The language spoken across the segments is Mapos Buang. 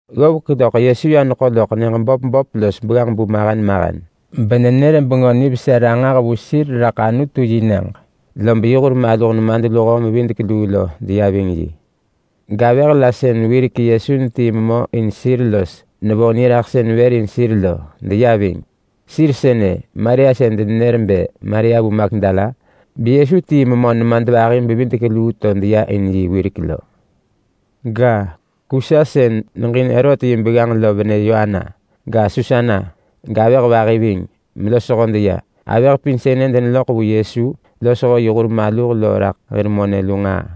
Ggovek loḳ Yesu ya neḳo loḳ nyëġ böp böp los begganġ-bu mahen mahen, benenër Bengö Nivesa ranġah vu sir raḳ Anutu-yi-nyëġ. Lob yi hur maluh nemadluho-mevidek-luu lo deya ving yi. Gavëh la sën wirek Yesu netii memö in sir los nevo niraḳsën vër in sir lo deya ving. Sir sënë: Maria sën denenër bë Maria vu Magdala, beYesu tii memö nemadvahi-bevidek-luu to deya in yi wirek lo. Ga, Kusa sën neġin Herot yi begganġ lo venë Yoana, ga, Susana, gavëh vahi ving, melosho deya. Avëh pin sënë deneloḳ vu Yesu losho yi hur maluh lo raḳ hir monë lu nġaa.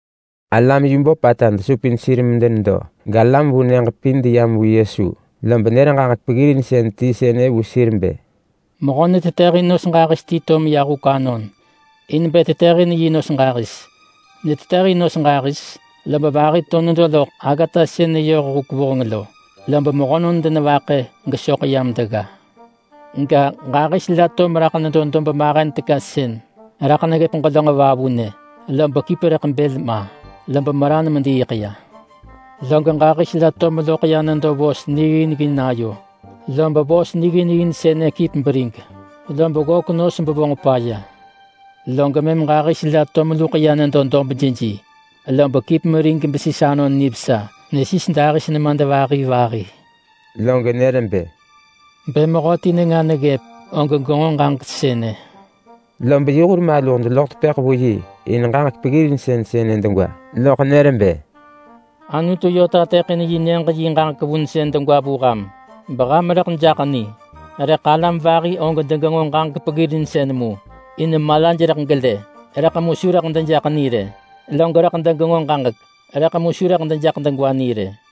Alam yu böpata desupin sir medenedo galam vu nyëġ pin deyam vu Yesu, lob nër ġaġek peggirinsën ti sënë vu sir bë, “Mehö netetëhin nos ġahis ti to meya huk anon in bë tetëhin yi nos ġahis. Netetëhin nos ġahis, lob vahi to nedo loḳ aggata sën neyoh huk vuheng lo, lob mehönon denevaḳë gesoḳ yam degga. Ga, ġahis la to meraḳ nedo dob mahen teka sën raḳ neggëp ġelönġ vavunë, lob kip rëḳ bël ma, lob meran mediiḳ ya. Log ġahis la to meloḳ ya nedo vos nigginggin ayo, lob vos nigginggin sënë kip berig, lob ggök nos bevonġ paya. Log mëm ġahis la to meluḳ ya nedo dob jeji, lob kip merig besis anon nivesa. Nesis dahis nemadvahi vahi.” Log nër bë, “Bë mehöti nenga neggëp, og genġo ġaġek sënë.” Lob yi hur maluh deloḳ tepëḳ vu yi in ġaġek peggirinsën sënë degwa. Loḳ nër bë, “Anutu yö tateḳin yi nyëġ yi ġaġek vunsën degwa vu ham, beham rëḳ jaḳ ni. Rëḳ alam vahi og degenġo ġaġek peggirinsën mu, ‘in malaj rëḳ gelë, rëḳ mu su rëḳ dejaḳ ni rë. Log rëḳ degenġo ġaġek, rëḳ mu su rëḳ dejaḳ degwa ni rë.’”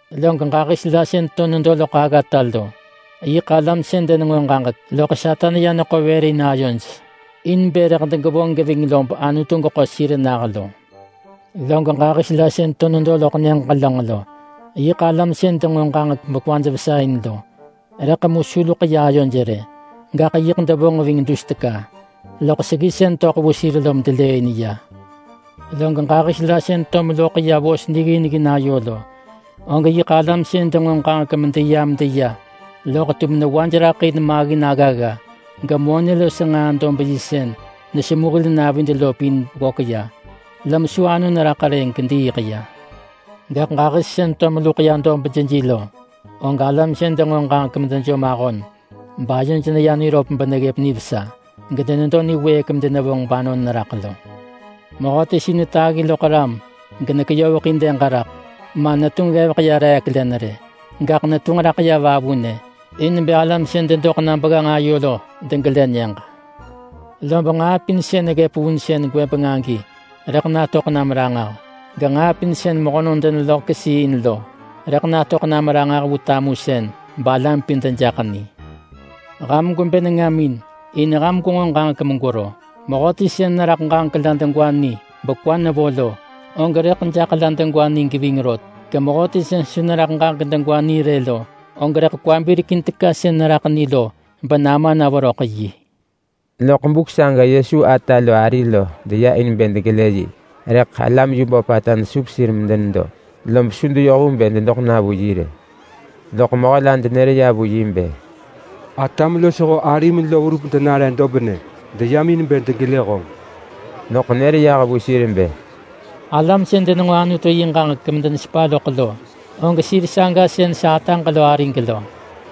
Log ġahis la sën to nedo loḳ aggata lo, yiḳ alam sën denenġo ġaġek, loḳ Satan ya neḳo vër in ayoj in bë rëḳ degevonġ geving lob Anutu geḳo sir nah lo. Log ġahis la sën to nedo loḳ nyëġ ġelönġ lo, yiḳ alam sën denġo ġaġek bekwaj vesa in lo, rëḳ mu su luḳ ya ayoj rë. Gaḳ yiḳ devonġ ving dus teka, loḳ seggisën töḳ vu sir lom delëëin ya. Log ġahis la sën to meloḳ ya vos nigginggin ayo lo, og yiḳ alam sën denġo ġaġek medeya medeya, loḳ tum newaj raḳ in maggin aggagga, gemonë los nġaa-dob-yi sën nesemu hil navid lo pin ggök ya, lom su anon raḳ rë gediiḳ ya. Gaḳ ġahis sën to meluḳ ya dob jeji lo, og alam sën denġo ġaġek medejom ahon bayoj neya niröp beneggëp nivesa, gedenedo niwëëk medenevonġ banon neraḳ lo.” “Mehöti su netaggi loḳ ram genekeyoveḳin dëg raḳ, ma netunġ ggevek ya reek len rë. Gaḳ netunġ raḳ ya vavunë, in bë alam sën dedoḳ na begganġ ayo lo degelë nyëġ. Lob nġaa pin sën neggëp vunsën gwëbeng agi rëḳ natöḳ nam ranġah. Genġaa pin sën mehönon deneloḳ kesii in lo, rëḳ natöḳ nam ranġah vu tamusën balam pin dejaḳ ni. Ham gwebë nengamin, in ham gwenġo ġaġek megwero. Mehöti sën neraḳ ġaġek la degwa ni bekwa nevo lo, og rëḳ jaḳ la degwa ni geving rot. Gemehöti sën su neraḳ ġaġek degwa ni rë lo, og rëḳ kwa birekin teka sën neraḳ ni lo benama na veröḳ yi.” Loḳ buk saga Yesu ata lo ari lo deya in bë degelë yi, rëḳ alam yu böpata desup sir medenedo, lob su deyoh vu bë dedoḳ na vu yi rë. Loḳ mehö la denër ya vu yi bë, “Atam losho arim lo verup denare dobnë. Deyam in bë degelë honġ.” Loḳ nër yah vu sir bë, “Alam sën denenġo Anutu yi ġaġek medenesepa loḳ lo, og sir saga sën sa ataġ lo arig lo.”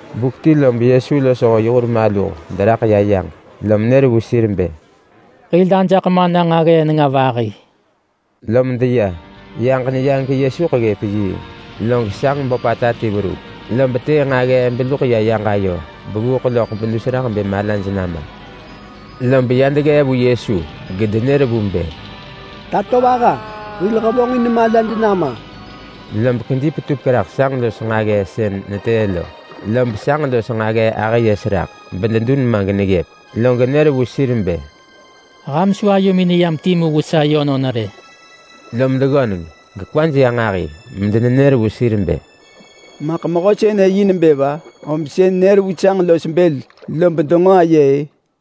Buk ti lob Yesu losho yi hur maluh deraḳ ya yaġ, lom nër vu sir bë, “Hil ajaḳ mana nġaggee nenga vahi.” Lom deya. Yaġ neya geYesuḳ ggëp yiing. Log sanġ böpata ti verup, lob vonġ benġaggee neluḳ ya yaġ ayo bevuuḳ loḳ bedus raḳ bë malaj nama. Lob ya deggee vu Yesu gedenër vu bë, “Tatovaha! Hil hevonġin malad nama!” Lob kedi petupek raḳ sanġ los nġaggee sën netëë lo, lob sanġ los nġaggee ahë yes raḳ, gededun ma geneggëp. Log nër vu sir bë, “Ham su ayomin neyam timu vu sa yönon rë!” Lom deggöneng gekwaj ya nġahi medenenër vu sir bë, “Maḳ mehö sënë yi nebë va, om sën nër vu sanġ los bël, lob denġo aye-ë?”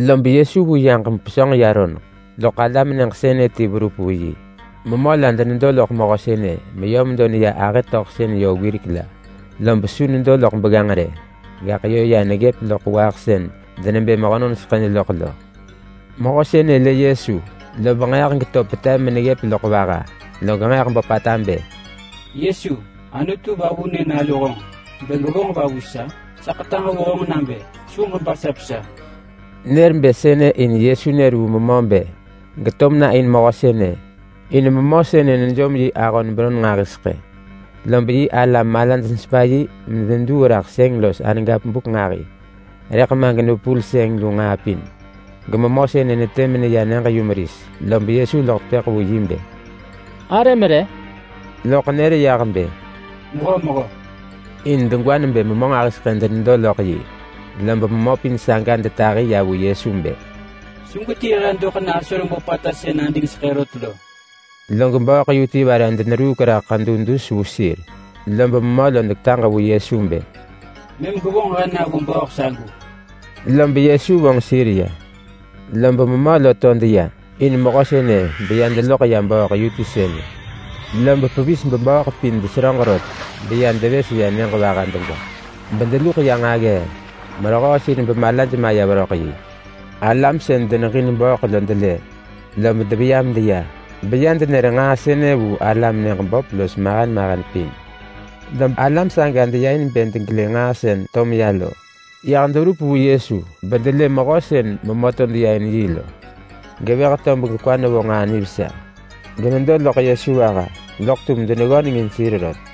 Lob Yesu vu yaġ mepesönġ ya roneḳ, loḳ alam nyëġ sënë ti verup vu yi. Memö la denedo loḳ mehö sënë meyö medo neya ahë töḳsën yö wirek la, lob su nedo loḳ begganġ rë, gaḳ yö ya neggëp loḳ waaḳ sën denebë mehönon seḳëj loḳ lo. Mehö sënë lë Yesu, lob nġeeḳ geto petev meneggëp loḳ vaha. Log nġeeḳ böpata bë, “Yesu! Anutu Vavunë Nalu honġ! Bë gwevonġ va vu sa? Sa ḳetaġ vu honġ nabë su ġebasap sa!” Nër bë sënë in Yesu nër vu memö bë geto mena in mehö sënë, in memö sënë nejom yi ahon beron nġahiseḳë. Lob yi alam malaj nesepa yi medeneduu raḳ sëng los aën buk nġahi, rëḳ ma genevepul sëng lu nġaa pin. Gememö sënë netë meneya nyëġ-yumeris. Lob Yesu loḳ tepëḳ vu yi bë, “Arëm re?” Loḳ nër yah bë, “Mehömehö.” In degwa nebë memö nġahiseḳë denedo loḳ yi. Lob memö pin saga detahi ya vu Yesu bë, “Su gwetii he doḳ na asoreng böpata sën adingseḳë rot lo!” Log bööḳ yu ti vare deneruuk raḳ ḳedu dus vu sir, lob memö lo deketaġ vu Yesu bë, “Mëm gwevonġ he na vu bööḳ sagu!” Lob Yesu vonġ sir ya. Lob memö lo to deya in mehö sënë beya deloḳ ya bööḳ yu ti sënë. Lob pevis gebööḳ pin deseröġ rot beya devës ya nyëġ vaha degwa, bedeluḳ ya nġaggee merehöö sir bemalaj maya veröḳ yi. Lob alam sën deneġin bööḳ lo delë, lob deveya medeya, beya denër nġaa sënë vu alam nyëġ böp los mahen mahen pin. Lob alam saga deya in bë degelë nġaa sën to meya lo. Yah deverup vu Yesu bedelë mehö sën memö to deya in yi lo, gevëh tob gekwa nevo nġaa nivesa, genedo loḳ Yesu vaha. Loḳ tum deneggöneng in sir rot.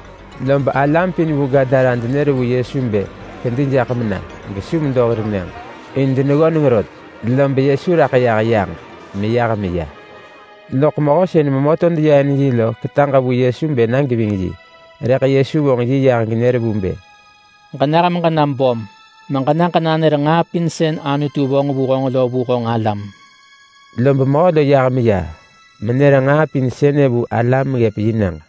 Lob alam pin vu Gadara denër vu Yesu bë kedi jaḳ mena, gesu medo hir nyëġ. In deneggöneng rot. Lob Yesu raḳ yah yaġ meyah meya. Loḳ mehö sën memö to deya in yi lo ketaġ vu Yesu bë na geving yi. Rëḳ Yesu vonġ yi yah genër vu bë, “Ġenah meġena böm, meġena ġenanër nġaa pin sën Anutu vonġ vu honġ lo vu honġ alam.” Lob mehö lo yah meya menër nġaa pin sënë vu alam ggëp yi nyëġ.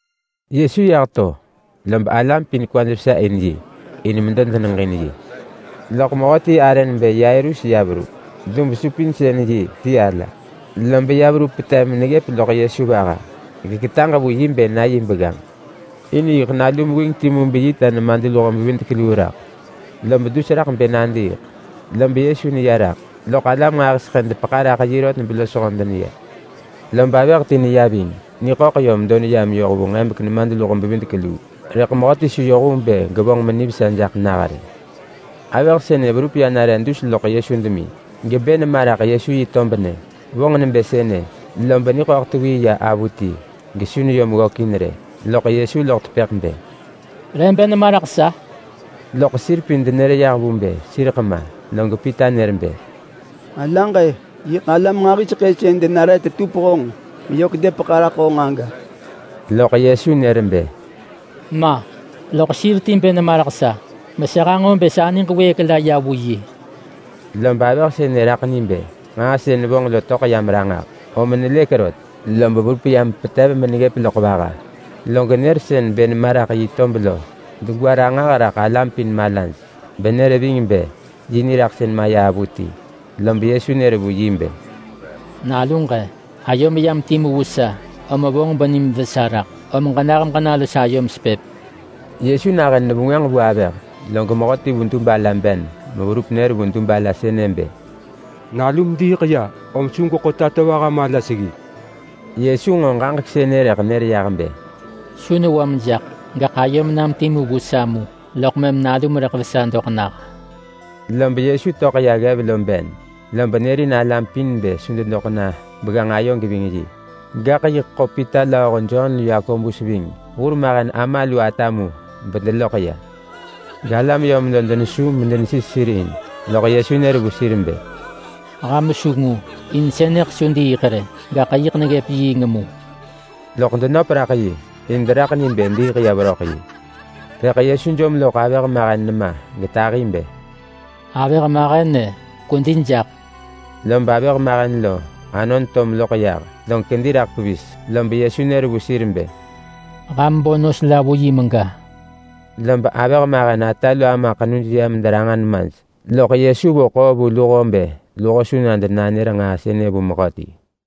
Yesu yah to, lob alam pin kwaj vesa in yi, in medo deneġin yi geyah to. Loḳ mehöti arë nebë Yairus ya verup. Dub-supinsën-yi ala ti yi, lob ya verup petev meneggëp loḳ Yesu vaha, geketaġ vu yi bë na yi begganġ. In yiḳ nalu mewing timu beyi ta nemadluho-bevidek-luu raḳ, lob dus raḳ bë nadiiḳ. Lob Yesu neya raḳ, loḳ alam nġahiseḳë depeḳa raḳ yi rot belosho deneya. Lob avëh ti neya ving. Niḳöḳ yö medo neyam yoh vu nġebek nemadluho-bevidek-luu, rëḳ mehöti su yoh vu bë gevonġ menivesa jaḳ nah rë. Avëh sënë verup ya nare dus loḳ Yesu demi gebë nema raḳ Yesu yi tob nyë. Vonġ nebë sënë, lob niḳöḳ tewii ya avuti gesu neyom ggökin rë. Loḳ Yesu loḳ tepëḳ bë, “Re bë nema raḳ sa?” Loḳ sir pin denenër yah vu bë sireḳ ma. Log Pita nër bë, “Sa alaġ-e! Yiḳ alam nġahiseḳë sën denare tetup honġ meyök depeḳa raḳ honġ aga.” Loḳ Yesu nër bë, “Ma! Loḳ sir ti bë nema raḳ sa, mesa hanġo bë sa niġ wëëk la ya vu yi.” Lob avëh sënë raḳ ni bë nġaa sën vonġ lo töḳ yam ranġah, om nelëk rot, lob verup ya mepetev meneggëp loḳ vaha, genër sën bë nema raḳ yi tob lo degwa ranġah vu raḳ alam pin malaj benër ving bë yi niraḳsën maya avuti. Lob Yesu nër vu yi bë, “Naluġ-e, ayom yam timu vu sa, om vonġ benim vesa raḳ. Om ġenah meġena los ayom sepëp.” Yesu nahën nevengwënġ vu avëh, log mehöti vu dub ala ben meverup nër vu dub ala sënë bë, “Nalum diiḳ ya, om su gweḳo Tatovaha mala seggi!” Yesu nġo ġaġek sënë rëḳ nër yah bë, “Su newam jaḳ, gaḳ ayom nam timu vu sa mu, loḳ mëm nalum rëḳ vesa doḳ nah.” Lob Yesu töḳ ya ggev lo ben, lob nërin alam pin bë su dedoḳ na begganġ ayo geving yi. Gaḳ yiḳ ḳo Pita lööho Jon lu Yakobus ving hurmahen ama lu ata mu bedeloḳ ya. Galam yö medo denesu medenesis sir in, loḳ Yesu nër vu sir bë, “Ham su ngu. In sënëḳ su diiḳ rë, gaḳ yiḳ neggëp yiing mu.” Loḳ denöp raḳ yi, in deraḳ ni bë diiḳ ya veröḳ yi. Rëḳ Yesu jom loḳ avëh mahen nema getahi bë, “Avëh mahen-e, kwedi jaḳ!” Lob avëh mahen lo anon to meloḳ yah, log kedi raḳ pevis. Lob Yesu nër vu sir bë, “Ham bo nos la vu yi mega.” Lob avëh mahen ata lu ama ḳenuj ya mederanġa nemaj. Loḳ Yesu vo ḳoo vu luho bë luho su na denanër nġaa sënë vu mehöti.